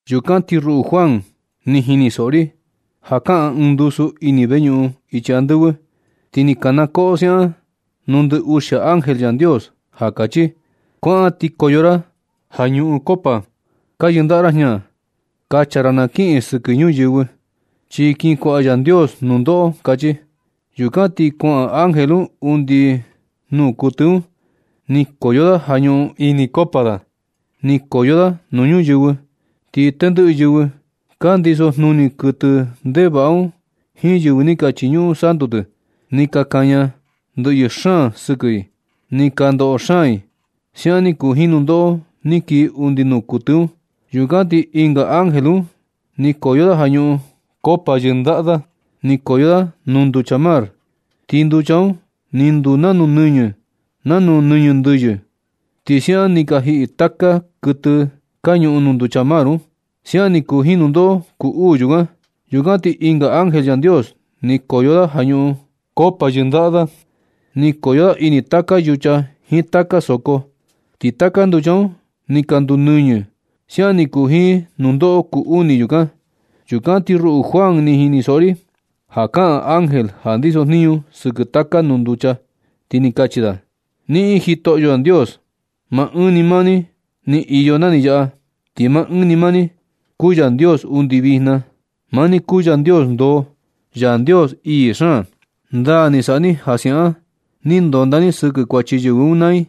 Yukan ti ruꞌu Juan ni jinisoꞌo ri ja kaꞌan ɨɨn ndusu ini veñuꞌun ichi andɨvɨ, ti kanakoꞌo siaꞌan nuu ndɨ uxia ángel Yandios ja kachi: ―Kuaꞌan ti koyo ra ja ñuꞌun koꞌo ka yɨndaꞌa ra jña. Kacha ra na kiꞌin sɨkɨ ñuyɨvɨ, chi kin kuaꞌa Yandios nundoꞌo ―kachi. Yukan ti kuaꞌan ángel undi nuu kuɨtɨ un. Ni koyo da ja ñuꞌun ini koꞌo da. Ni koyo da nuu ñuyɨvɨ. Ti tendɨꞌɨ yɨvɨ ka ndiso jnuni kuɨtɨ ndevaꞌa un jiin yɨvɨ ni ka chiñuꞌun santu tɨ, ni ka kaña ndɨꞌyɨ xaan sɨkɨ i, ti ka ndoꞌo xaan i. Siaꞌan ni kuu jiin nundoꞌo ni kii undi nuu kuɨtɨ un. Yukan ti ɨnga ángel un ni koyo da ja ñuꞌun koꞌo yɨndaꞌa da. Ni koyo da nuu nducha mar, ti nducha un ni nduu nanu nɨñɨ nanu nɨñɨ ndɨyɨ. Ti siaꞌan ni ka jiꞌi taka kuɨtɨ ka ñuꞌun nuu nducha mar un. Siaꞌan ni kuu jiin nundoꞌo kuu uu yukan. Yukan ti ɨnga ángel Yandios ni koyo da ja ñuꞌun koꞌo yɨndaꞌa da. Ni koyo da ini taka yucha jiin taka soko, ti taka nducha un ni ka nduu nɨñɨ. Siaꞌan ni kuu jiin nundoꞌo kuu uni yukan. Yukan ti ruꞌu Juan, ni jinisoꞌo ri ja kaꞌan ángel ja ndisojniñu sɨkɨ taka nuu nducha, ti ni kachi da: ―Niꞌin Jitoꞌyo Yandios. Maa ɨɨn ni maa ni iyo na ni yaꞌa, ti maa ɨɨn ni maa ni kuu Yandios undi vijna. Maa ni kuu Yandios ndoo, Yandios ii xaan. Ndaa ni saꞌa ni ja siaꞌan ni ndonda ni sɨkɨ kuachi yɨvɨ un maa i.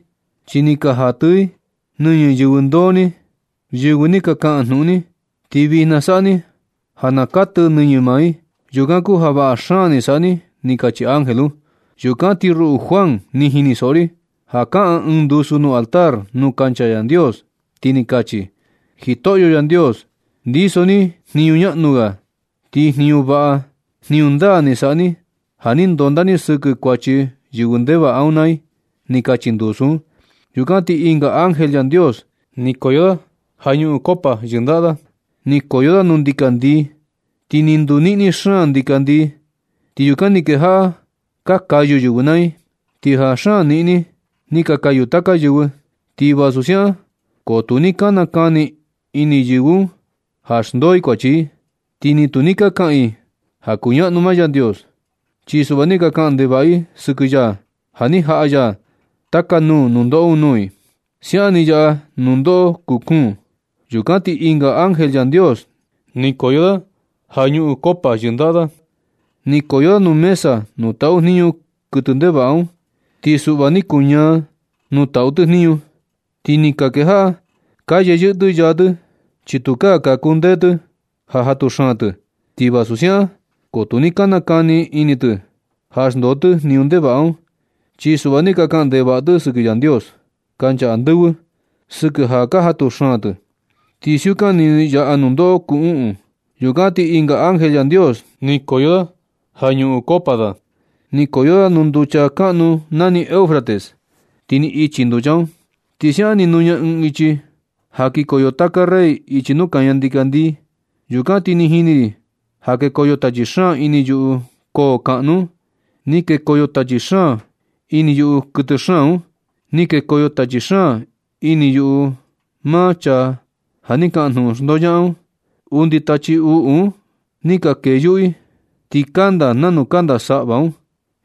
Chi ni ka jatɨ i nɨñɨ yɨvɨ ndoo ni, yɨvɨ ja ni ka kaꞌan jnuꞌun ni. Ti vijna saꞌa ni ja na katɨ nɨñɨ maa i. Yukan kuu ja vaꞌa xaan ni saꞌa ni ―ni kachi ángel un. Yukan ti ruꞌu Juan, ni jinisoꞌo ri ja kaꞌan ɨɨn ndusu nuu altar nuu kancha Yandios, ti ni kachi: ―Jitoꞌyo Yandios. Ndiso ni jniñu ñaꞌnu ga. Ti jniñu vaꞌa, jniñu ndaa ni saꞌa ni ja ni ndonda ni sɨkɨ kuachi yɨvɨ ndevaꞌa un naa i ―ni kachi ndusu un. Yukan ti ɨnga ángel Yandios ni koyo da ja ñuꞌun koꞌo yɨndaꞌa da, ni koyo da nuu ndikandii. Ti ni nduu niꞌni xaan ndikandii, ti yukan ni kejaꞌa ka kayu yɨvɨ naa i. Ti ja xaan niꞌni, ni ka kayu taka yɨvɨ. Ti vasu siaꞌan ko tu ni ka nakani ini yɨvɨ un ja xndoo i kuachi i, ti ni tu ni ka kaꞌan i ja kuñaꞌnu maa Yandios. Chi suꞌva ni ka kaꞌan ndevaꞌa i sɨkɨ ya ja ni jaꞌa ya taka nuu nundoꞌo un nuu i. Siaꞌan ni yaꞌa nundoꞌo kuu kuun. Yukan ti ɨnga ángel Yandios ni koyo da ja ñuꞌun koꞌo yɨndaꞌa da. Ni koyo da nuu mesa nuu taꞌu jniñu kuɨtɨ ndevaꞌa un. Ti suꞌva ni kuñaa nuu taꞌu tɨ jniñu. Ti ni ka kejaꞌa ka yeyɨꞌɨ tɨ yaa tɨ, chi tukaa ka kundee tɨ ja jatu xaan tɨ. Ti vasu siaꞌan ko tu ni ka nakani ini tɨ ja xndoo tɨ jniñu ndevaꞌa un. Chi suꞌva ni ka kaꞌan ndevaꞌa tɨ sɨkɨ Yandios kancha andɨvɨ sɨkɨ ja ka jatu xaan tɨ. Ti siukan ni yaꞌa nundoꞌo kuu uꞌun. Yukan ti ɨnga ángel Yandios ni koyo da ja ñuꞌun koꞌo da. Ni koyo da nuu nducha kaꞌnu nani Eufrates. Ti ni ichi nducha un. Ti siaꞌan ni nuña ɨɨn ichi ja kikoyo taka rey ichi nuu kaña ndikandii. Yukan ti ni jini ri ja kekoyo tachi xaan ini yuꞌu koo kaꞌnu un. Ni kekoyo tachi xaan ini yuꞌu kuɨtɨ xaan un. Ni kekoyo tachi xaan ini yuꞌu maa chaa ja ni kaꞌan jnuꞌun xndoñaꞌan un. Undi tachi uꞌu un ni ka kee yuꞌu i, ti kanda nanu kanda saꞌva un.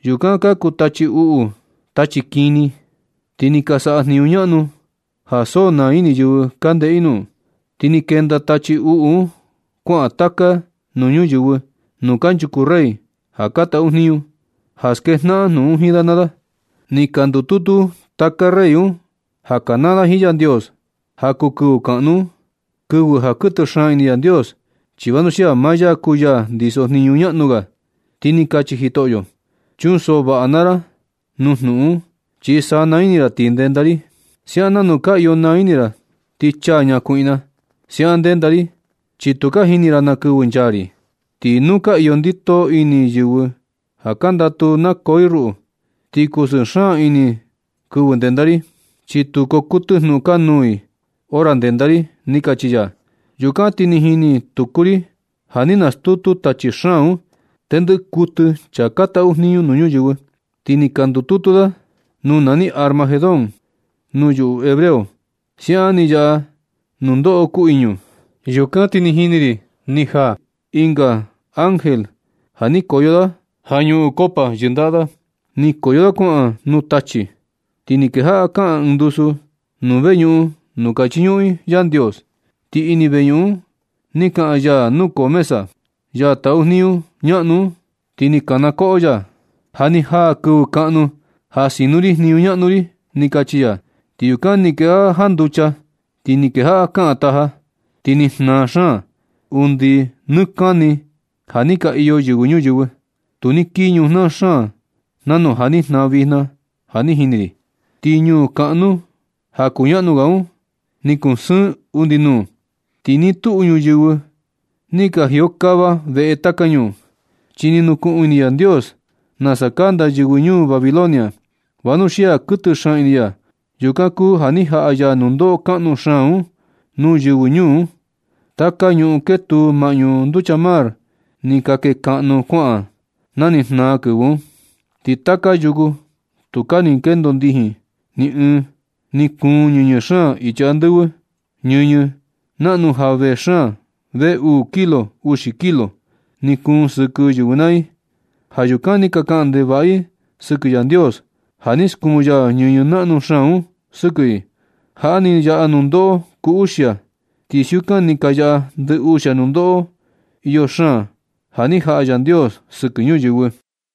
Yukan ka kuu tachi uꞌu tachi kini, ti ni ka saꞌa jniñu ñaꞌnu ja so naa ini yɨvɨ ka ndeꞌe i nuu. Ti ni kenda tachi uꞌu un kuaꞌan taka nuu ñuyɨvɨ nuu kanchuku rey ja ka taꞌu jniñu, ja skejnaꞌan jnuꞌun jiin da naa da, ti na ndututu taka rey un ja kanaa da jiin Yandios ja kuu kɨvɨ kaꞌnu un, kɨvɨ ja kuɨtɨ xaan ini Yandios, chi vanuxia maa ya kuu ya ndisojniñu ñaꞌnu ga. Ti ni kachi Jitoꞌyo: ―Chunsoꞌo vaꞌa naa ra nuu jnuꞌun un, chi sanaa ini ra ti ndenda ri, siaꞌan nanu ka iyo naa ini ra ti chaa ñakuiꞌna. Siaꞌan ndenda ri, chi tu ka jini ra na kɨvɨ nchaa ri. Ti nuu ka iyo ndito ini yɨvɨ ja ka ndatu nakoo i ruꞌu, ti kusɨɨ xaan ini i kɨvɨ ndenda ri. Chi tu koo kuɨtɨ jnuꞌun kanuu nuu i hora ndenda ri ―ni kachi ya. Yukan ti ni jini tuku ri ja ni nastutu tachi xaan un tendɨꞌɨ kuɨtɨ chaa ka taꞌu jniñu nuu ñuyɨvɨ, ti ni ka ndututu da nuu nani Armagedón nuu yuꞌu hebreo. Siaꞌan ni yaꞌa nundoꞌo kuu iñu. Yukan ti ni jini ri ni jaa ɨnga ángel ti ni koyo da ja ñuꞌun koꞌo yɨndaꞌa da. Ni koyo da kuaꞌan nuu tachi. Ti ni kejaꞌa kaꞌan ɨɨn ndusu nuu veñuꞌun nuu ka chiñuꞌun i Yandios. Ti undi ini veñuꞌun un ni kaꞌan ya nukoo mesa, ya taꞌu jniñu ñaꞌnu un, ti ni kanakoꞌo ya: ―Ja ni jaa kɨvɨ kaꞌnu ja sino ri jniñu ñaꞌnu ri ―ni kachi ya. Ti yukan ni kejaꞌa janducha, ti ni kejaꞌa kaꞌan taja, ti ni jnaa xaan. Undi nɨ kani ja ni ka iyo yɨvɨ ñuyɨvɨ, tu ni kii ɨɨn ñujnaa xaan nanu ja ni jnaa vijna ja ni jini ri. Ti ñuu kaꞌnu ja kuñaꞌnu ga un, ni kusɨɨn undi uni nuu. Ti nɨ tuꞌu ñuyɨvɨ ni ka jiokava veꞌe taka ñuu. Chi ni nukuꞌun ini Yandios nasa kanda yɨvɨ ñuu Babilonia, vanuxia kuɨtɨ xaan ini ya, yukan kuu ja ni jaꞌa ya nundoꞌo kaꞌnu xaan un nuu yɨvɨ ñuu un. Taka ñuꞌun ketuu maꞌñu nducha mar ni ka kekaꞌnu kuaꞌan na ni jnaa kɨvɨ un, ti taka yuku tukaa ni kendo ndijin ni ɨɨn. Ni kuun ñɨñɨ xaan ichi andɨvɨ. Ñɨñɨ naꞌnu ja vee xaan vee uu xiko uxi kilo, ni kuun sɨkɨ yɨvɨ naa i. Ja yukan ni ka kaꞌan ndevaꞌa i sɨkɨ Yandios, ja ni skuun ya ñɨñɨ naꞌnu xaan un sɨkɨ i. Jaꞌa ni yaꞌa nundoꞌo kuu uxia. Ti siukan ni ka yaꞌa ndɨ uxia nundoꞌo iyo xaan ja ni jaꞌa Yandios sɨkɨ ñuyɨvɨ.